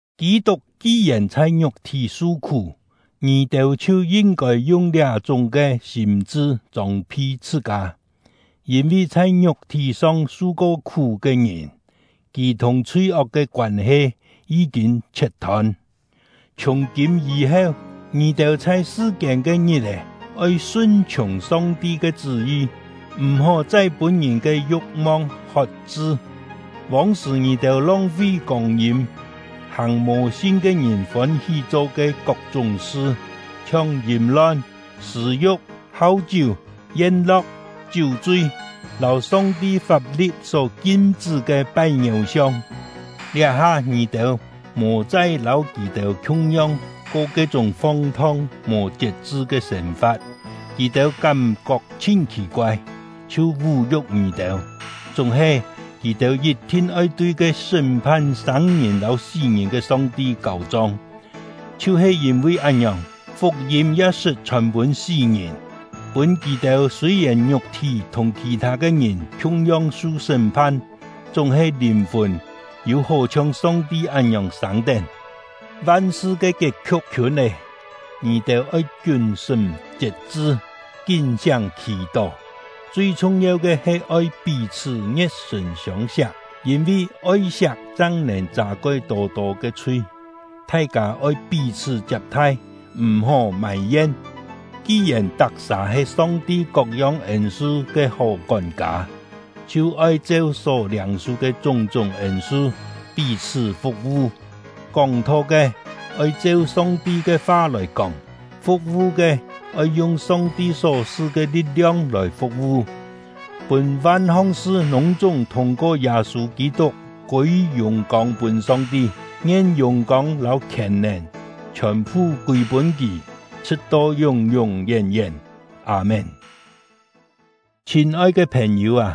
Kî-tuk ki-yèn chhai ngiuk-thí su-khú, ngì-têu chhiu yin-kôi yung liá-chúng ke sîm-chṳ chông-phi chhṳ-kâ, yîn-vi chhai ngiuk-thí-song su-ko khú ke ngìn, kì thùng chhui-ok ke koân-he yí-kîn chhiet-thôn; chhiùng-kîm yî-heu, ngì-têu chhai sṳ-kiên ke ngit-è oi sun-chhiùng Song-ti ke chṳ́-yi, m̀-hó chai pûn ngìn ke yu̍k-mong hot-chṳ. Vông-sṳ̀ ngì-têu long-fi kông-yîm, hàng mò sin ke ngìn fôn-hí cho ke kok-chúng sṳ, chhiong yìm-lon, sṳ̂-yu̍k, hau-chiú, yen-lo̍k, chiú-chui, lâu Song-ti fap-li̍t só kim-chṳ́ ke pai ngiéu-siong. Liá-ha ngì-têu mò chai lâu kì-têu khiung-yong ko ke-chúng fong-thong, mò chiet-chṳ ke sên-fa̍t, kì-têu kám-kok chhin khì-koai, chhiu vú-yu̍k ngì-têu. Chúng-he, kì-têu yit-thin oi tui ke sṳ́m-phan sâng-ngìn lâu sí-ngìn ke Song-ti kâu-chong. Chhiu-he yîn-vi án-ngiòng, fuk-yîm ya sṳt chhòn pûn sí-ngìn, pûn kì-têu sûi-yèn ngiuk-thí thùng khì-thâ ke ngìn khiung-yong su sṳ́m-phan, chúng-he lìn-fùn yû-hó chhiong Song-ti án-ngiòng sâng-tén. Van-sṳ ke kiet-khiu̍k khiûn lé. Ngì-têu oi kiún-sṳ́m chiet-chṳ, kín-siáng khì-tó. Chui chhung-yeu ke he oi pí-chhṳ́ ngie̍t-sṳ̀n siông-siak, yîn-vi oi-siak chang nèn châ-koi tô-tô ke chhui. Thai-kâ oi pí-chhṳ́ chiap-thai, m̀-hó mài-yen. Ki-yèn tak-sà he Song-ti kok-yong ên-su ke hó kón-kâ, chhiu oi cheu só liâng-su ke chúng-chúng ên-su, pí-chhṳ́ fu̍k-vu. Kóng-tho ke, oi cheu Song-ti ke fa lòi kóng; fu̍k-vu ke, oi yung Song-ti só su ke li̍t-liong lòi fu̍k-vu, pûn van-hong sṳ lûng-chúng thûng-ko Yâ-sû Kî-tuk kûi yùng-kông pûn Song-ti. Ngien yùng-kông lâu khièn-nèn chhiòn-phu kûi-pûn Kì, chhṳ̍t-to yún-yún yén-yén! Â-mén. Chhîn-oi ke phèn-yû â,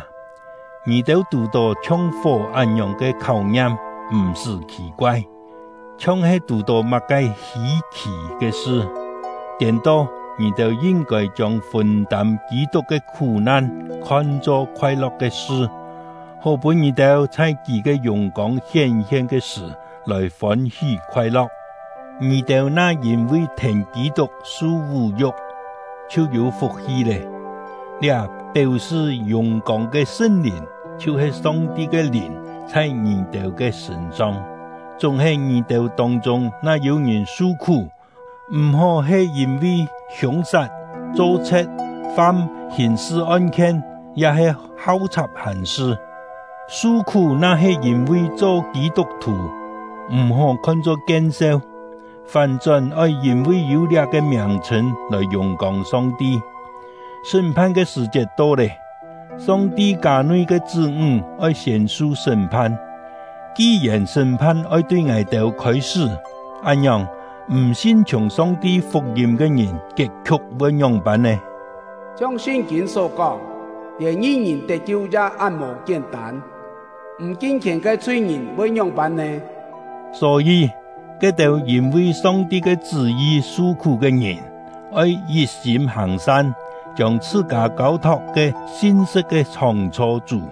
ngì-têu tù-tó chhiong fó án-ngiòng ke kháu-ngiam, m̀-sṳ́ khì-koai, chhiong-he tù-tó má-ke hî-khì ke sṳ. Tiên-to, ngì-têu yin-kôi chiông fûn-tâm Kî-tuk ke khú-nan khon-cho khoai-lo̍k ke sṳ, hó pûn ngì-têu chhai kì ke yùng-kông hién-hien ke sṳ̀ lòi fôn-hí khoai-lo̍k. Ngì-têu na yîn-vi thèn Kî-tuk su vú-yu̍k, chhiu yû fuk-hi lé! Liá péu-sṳ yùng-kông ke Sṳn-Lìn, chhiu-he Song-ti ke Lìn, chhai ngì-têu ke sṳ̂n-song. Chúng-he, ngì-têu tông-chûng na yû-ngìn su-khú, m̀-hó he yîn-vi hiûng-sat, cho chhe̍t, fam hìn-sṳ on-khien, ya-he hau chhap hàn-sṳ. Su-khú na-he yîn-vi cho Kî-tuk-thù, m̀-hó khon-cho kien-seu, fán-chón oi yîn-vi yû liá-ke miàng-chhṳ̂n lòi yùng-kông Song-ti. Sṳ́m-phan ke sṳ̀-chiet to lé, Song-ti kâ-nui ke chṳ́-ńg oi siên su sṳ́m-phan. Ki-yèn sṳ́m-phan oi tui ngài-têu khôi-sṳ́, án-ngiòng, m̀ sin-chhiùng Song-ti fuk-yîm ke ngìn kiet-khiu̍k voi ngióng-pân nè? Chhiong Sṳn-kîn só kóng: Lièn ngi-ngìn tet-kiu ya án mò kién-tân, m̀ kin-khièn ke chhui-ngìn voi ngióng-pân nè? Só-yî, ke-têu yîn-vi Song-ti ke chṳ́-yi su-khú ke ngìn, oi yit-sîm hàng-san, chiông chhṳ-kâ kâu-thok ke sin-sṳ̍t ke Chhóng-chho Chú.